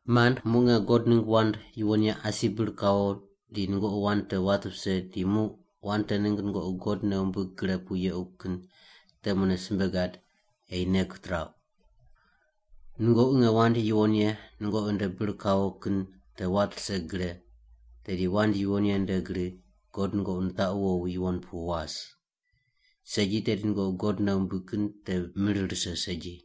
Mand, muq nge God ningg wand yuwon ye asi bir kawo di nungoqi wand te wat vise di muq wand te ningg nungoqi God nei wumbig gre pu yequ kin te mune simbe gad ei nei kitirauq. Nungoqi nge wand yuwon ye nungoqi nde bir kawo kin te wat rise gre, tedi wand yuwon ye nde gri God nungoqi nitaqu wowi yuwon pu was. Segi tedi nungoqi God nei wumbig kin te mir rise segi.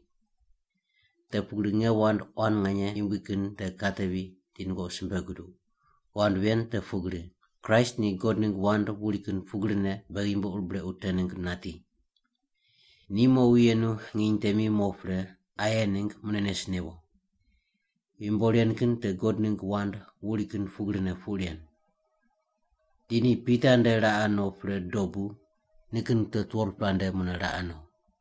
Te pugri nge wand quan nganye yumbui kin te katevi di nungoqi simbe guduq. Wand ven te pugri: Kraist ni God ningg wand wuri kin pugrine beghi yumbo ur brequ te ningg nati. Ni mowi yenu nginy temi mo pre aye ningg mune nes newo. Yumbo ren kin te God ningg wand wuri kin pugrine puq ren. Di ni Pita nde raqe no pre dobu nikin wute 12-pela nde mune raqe no.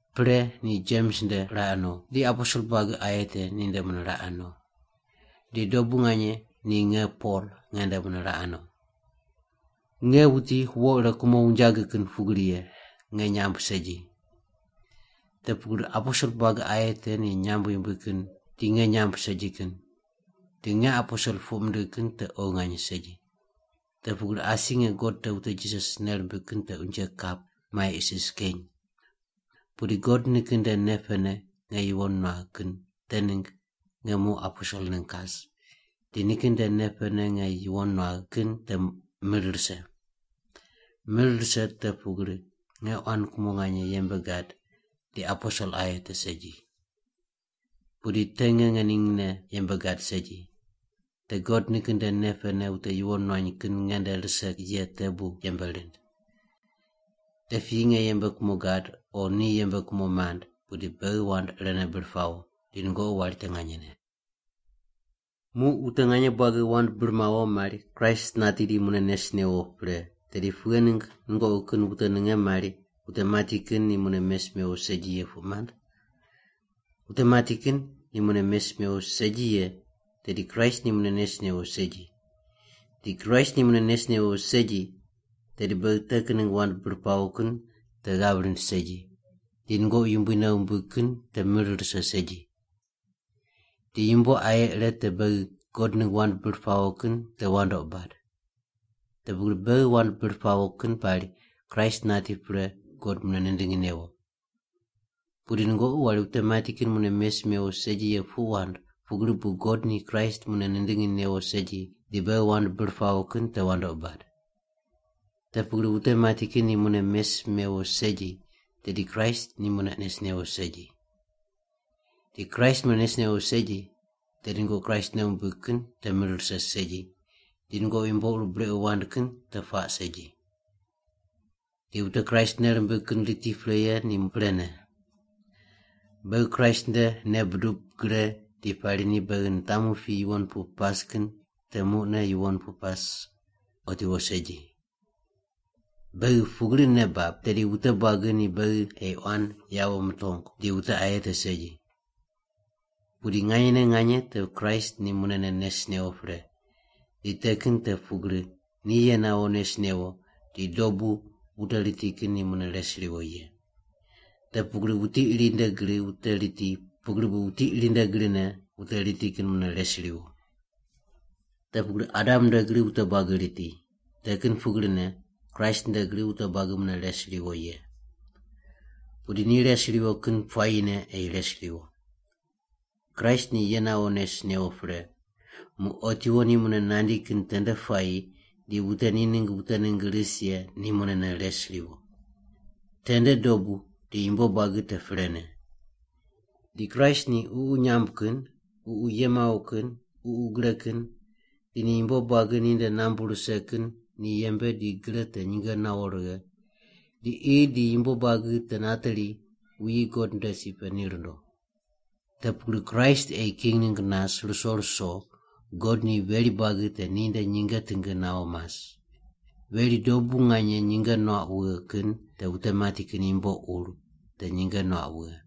Pre ni Jems nde raqe no, di aposel buagi aye te ninde mune raqe no, di dobu nganye ni nge Pol nge nde mune raqe no. Nge wuti wo ire kumo wunjagi kin pugri ye, nge nyamb segi. Te pugri aposel buagi aye te ni nyamb yumbui kin di nge nyamb segi kin. Di nge aposel puq mindigh kin te oghi nganye segi. Te pugri asi nge God te wute Jisas nei rimbig kin te unje kap mai isis keny. Pudi God nikin nde nei pene nge yuwon nuagh kin te ningg nge muq aposel ningg kas, di nikin nde nei pene nge yuwon nuagh kin te mir rise. Mir rise te pugri nge quan kumo nganye yembe gad di aposel aye te segi. Pudi te nge ngeningne yembe gad segi. Te God nikin nde nei pene wute yuwon nuany kin nge nde rise ye te bu yembe rind. Te piyi nge yembe kumo gad o ni yembe kumo mand, pudi beghi wand irene bir pawo di nungoqi wari te nganyene. Muq wute nganye buagi wand bir mawo mari Kraist nati di mune nes newo pre, tedi pughe ningg nungoqi kin wute ninge mari wute mati kin ni mune mes mewo segi ye puq mand? Wute mati kin ni mune mes mewo segi ye tedi Kraist ni mune nes newo segi. Di Kraist ni mune nes newo segi, tedi beghi te kin ningg wand bir pawo kin te ghav rind segi, di nungoqi Yumbui nei wumbig kin te mir rise segi. Di yumbo aye ire te beghi God ningg wand bir pawo kin te wandoqi bad. Te pugri beghi wand bir pawo kin pari Kraist nati pre God mune nindingi newo. Pudi nungoqi wari wute mati kin mune mes mewo segi ye puq wand pugri bu God ni Kraist mune nindingi newo segi di beghi wand bir pawo kin te wandoqi bad. Te pugri wute mati kin ni mune mes mewo segi tedi Kraist ni mune nes newo segi. Di Kraist mune nes newo segi, tedi nungoqi Kraist nei wumbig kin te mir rise segi, di nungoqi yumbo ur brequ wand kin te puaq segi. Di wute Kraist nei rimbig kin riti pre ye ni prene. Beghi Kraist nde nei budub gre di pari ni beghi nitamu pi yuwon pu pas kin te muqne yuwon pu pas otiwo segi. Beghi pugri nei bab, tedi wute buagi ni beghi ei quan yawo mutongu di wute aye te segi. Pudi nganyene nganye te Kraist ni munene nes newo pre, di te kin te pugri ni ye nawo nes newo di dobu wute riti kin ni mune res riwo ye. Te pugri wuti iri nde gri wute riti pugri bu wuti iri nde grine wute riti kin mune res riwo. Te pugri Adam nde gri wute buagi riti, te kin pugrine Kraist nde gri wute buagi mune res riwo ye. Pudi ni res riwo kin puayine ei res riwo. Kraist ni ye nawo nes newo pre, muq otiwo ni mune nandi kin tende puayi di wute ni ningg wute ningg ris ye ni mune res riwo. Tende dobu di yumbo buagi te prene. Di Kraist ni ququ nyamb kin, ququ ye mawo kin, ququ gre kin, di ni yumbo buagi ninde nambu rise kin ni yembe di gre te nyinge nawo righe, di qi di yumbo buagi te nateri wuyi God nde si pe ni rundo. Te pugri Kraist ei king ningg nas ruso ruso God ni veri buagi te ninde nyinge tingi nawo mas. Veri dobu nganye nyinge nuaq wughe kin te wute mati kin yumbo ur te nyinge nuaq wughe.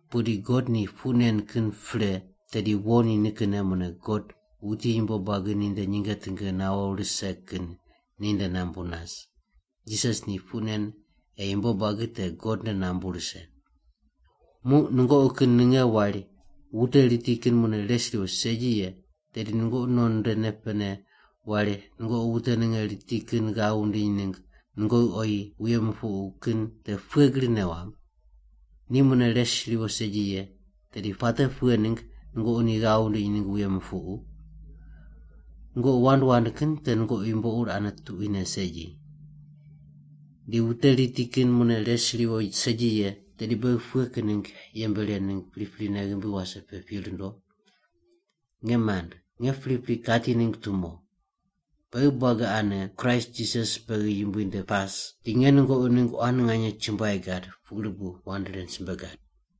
Pudi God ni puq nen kin pre tedi wo ni nikinne mune God wuti yumbo buagi ninde nyinge tingi nawo rise kin ninde nambu nas. Jisas ni puq nen ei yumbo buagi te God nde nambu rise. Muq nungoqi kin ninge wari wute riti kin mune res riwo segi ye tedi nungoqi non nde nei pene wari nungoqi wute ninge riti kin ghav wundiny ningg nungoqi oyi wuye mupuqu kin te pughe gri nei wamb? Ni mune res riwo segi ye tedi puate pughe ningg nungoqi ni ghav wundiny ningg wuye mupuqu? Nungoqi wand wand kin te nungoqi yumbo ur ane tuquine segi. Di wute riti kin mune res riwo segi ye tedi beghi pughe kin ningg yembe ren ningg priprine ghimbi wase pe pi rundo? Nge mand, nge pripri kati ningg tumo. Beghi buagi ane Kraist Jisas beghi Yumbui nde pas di nge nungoqi ningg quan nganye chumbuai gad pugri bu wand ren simbe gad.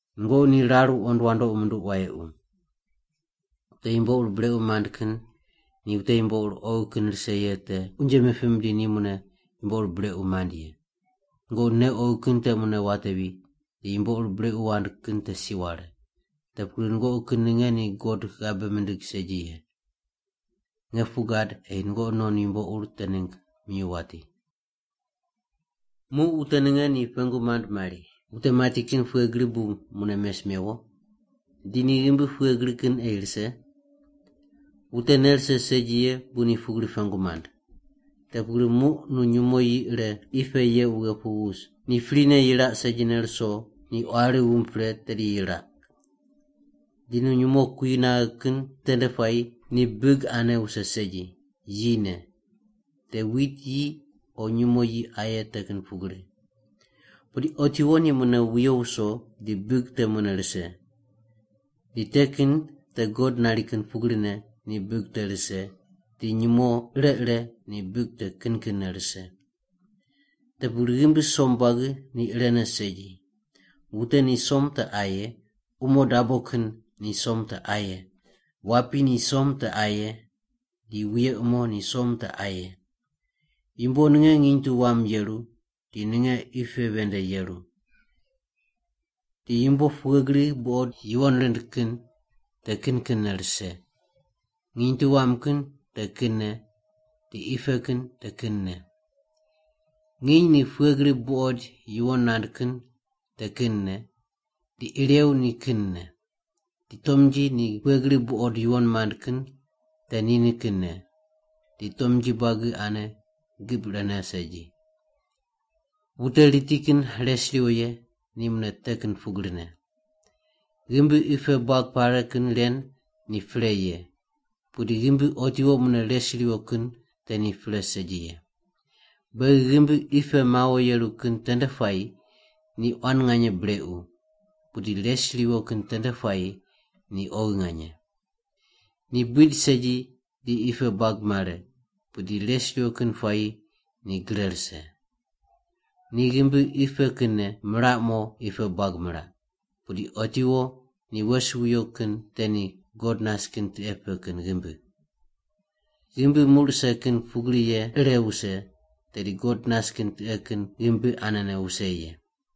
Nungoqi ni rar wuqond wandoqi munduq wayequ. Wute yumbo ur brequ mand kin ni wute yumbo ur oghi kin rise ye te unje mipim di ni mune yumbo ur brequ mand ye. Nungoqi nei oghi kin te mune watevi di yumbo ur brequ wand kin te si ware. Te pugri nungoqi kin ninge ni God ghabe mimbig segi ye. Nge puq gad ei nungoqi non yumbo ur te ningg minyuw wati. Muq wute ninge ni pengu mand mari, “Wute mati kin pughe gri bu mune mes mewo? Di ni ghimbi pughe gri kin ei rise?” Wute nei rise segi ye bu ni pugri pengu mand. Te pugri muq nu nyumo yi ire qi pe yeq wughe pu wus, ni prine yiraq segine ruso ni quari wumb pre tedi yiraq. Di nu nyumo kui naghe kin tende puayi ni big ane wuse segi, yine. Te wit yi o nyumo yi aye te kin pugri. Pudi otiwo ni mune wiyo wuso di big te mune rise. Di te kin te God nari kin pugrine ni big te rise di nyumo ire ire ni big te kin kinne rise. Te pugri ghimbi som buagi ni irene segi. Wute ni som te aye, umo dabo kin ni som te aye, wapi ni som te aye, di wuye umo ni som te aye. Yumbo ninge nginy tu wam yeru, di ninge qi pe ven nde yeru. Di yumbo pughe gri buqod yuwon rind kin te kin kinne rise, nginy tu wam kin te kinne di qi pe kin te kinne. Nginy ni pughe gri buqoid yuwon nand kin te kinne di irew ni kinne. Di tomnji ni pughe gri buqod yuwon mand kin te ni nikinne, di tomnji buagi ane gib irene segi. Wute riti kin res riwo ye ni mune te kin pugrine. Ghimbi qi pe buag pare kin ren ni pre ye, pudi ghimbi otiwo mune res riwo kin te ni pre segi ye. Beghi ghimbi qi pe mawo yeru kin tende puayi ni quan nganye brequ, pudi res riwo kin tende puayi ni oghi nganye. Ni buid segi di qi pe buag mare, pudi res riwo kin puayi ni gre rise. Ni ghimbi qi pe kinne miraq mo qi pe buag miraq, pudi otiwo ni wes wuyo kin te ni God nas kin tiqe pe kin ghimbi. Ghimbi muq rise kin pugri ye ire wuse, tedi God nas kin tiqe kin ghimbi anene wuse ye.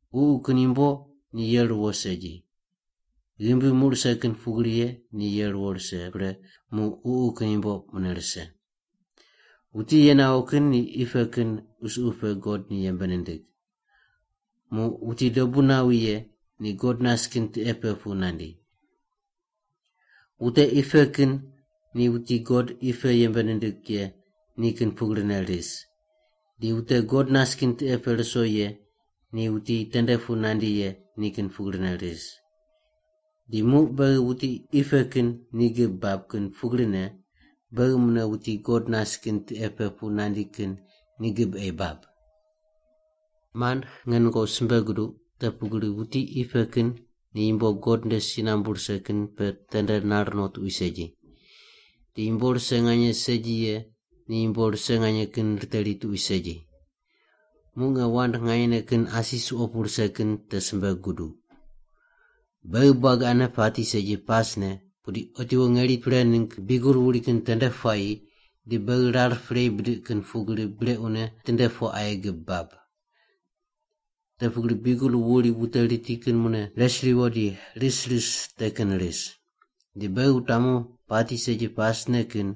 Ququ kin yumbo ni ye ruwo segi. Ghimbi muq rise kin pugri ye ni ye ruwo rise pre muq ququ kin yumbo mune rise. Wuti ye nawo kin ni qi pe kin qusuqu pe God ni yembe nindig, muq wuti dobu nawi ye ni God nas kin tiqe pe pu nandi. Wute qi pe kin ni wuti God qi pe yembe nindig ye ni kin pugrine ris di wute God nas kin tiqe pe ruso ye ni wuti tende pu nandi ye ni kin pugrine ris. Di muq beghi wuti qi pe kin ni gib bab kin pugrine beghi mune wuti God nas kin tiqe pe pu nandi kin ni gib ei bab. Mand, nge nungoqi simbe guduq te pugri wuti qi pe kin ni yumbo God nde si nambu rise kin pe tende nar no tuqui segi. Di yumbo rise nganye segi ye ni yumbo rise nganye kin riteri tuqui segi. Muq nge wand nganyene kin asi suqo pu rise kin te simbe guduq. Beghi buagi ane pati segi pasne, pudi otiwo ngeri pre ningg biugel wuri kin tende puayi di beghi rar prei bidiq kin pugri brequne tinde po aye gib bab. Te pugri biugel wuri wute riti kin mune res riwo di ris ris te kin ris. Di beghi wutamu pati segi pasne kin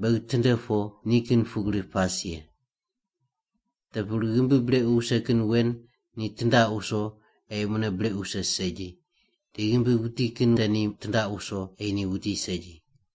beghi tinde po ni kin pugri pas ye. Te pugri ghimbi brequ wuse kin wen ni tindaq wuso ei mune brequ wuse segi, di ghimbi wuti kin te ni tindaq wuso ei ni wuti segi.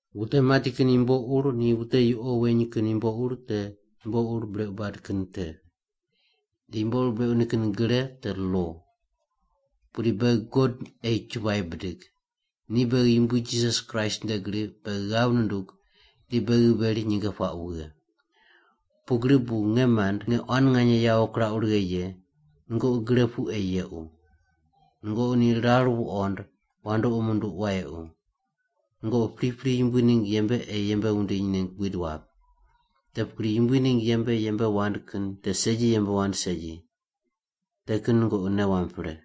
Wute mati kin yumbo ur ni wute yuqo weny kin yumbo te yumbo ur brequ bad kin te. Di yumbo ur brequ nikin gre te lo. Pudi beghi God ei chumbuai bidig! Ni beghi Yumbui Jisas Kraist nde gri beghi ghav nundug di beghi veri nyinge puaq wughe. Pugri bu, nge mand nge quan nganye yawo kirauq righe ye, nungoqi gre pu ei yequ. Nungoqi ni rar wuqond wandoqi munduq wayequ. Nungoqi pripri Yumbui ningg yembe ei yembe wundiny ningg buid wap. Te pugri Yumbui ningg yembe yembe wand kin te segi yembe wand segi. Te kin nungoqi nei wamb pre.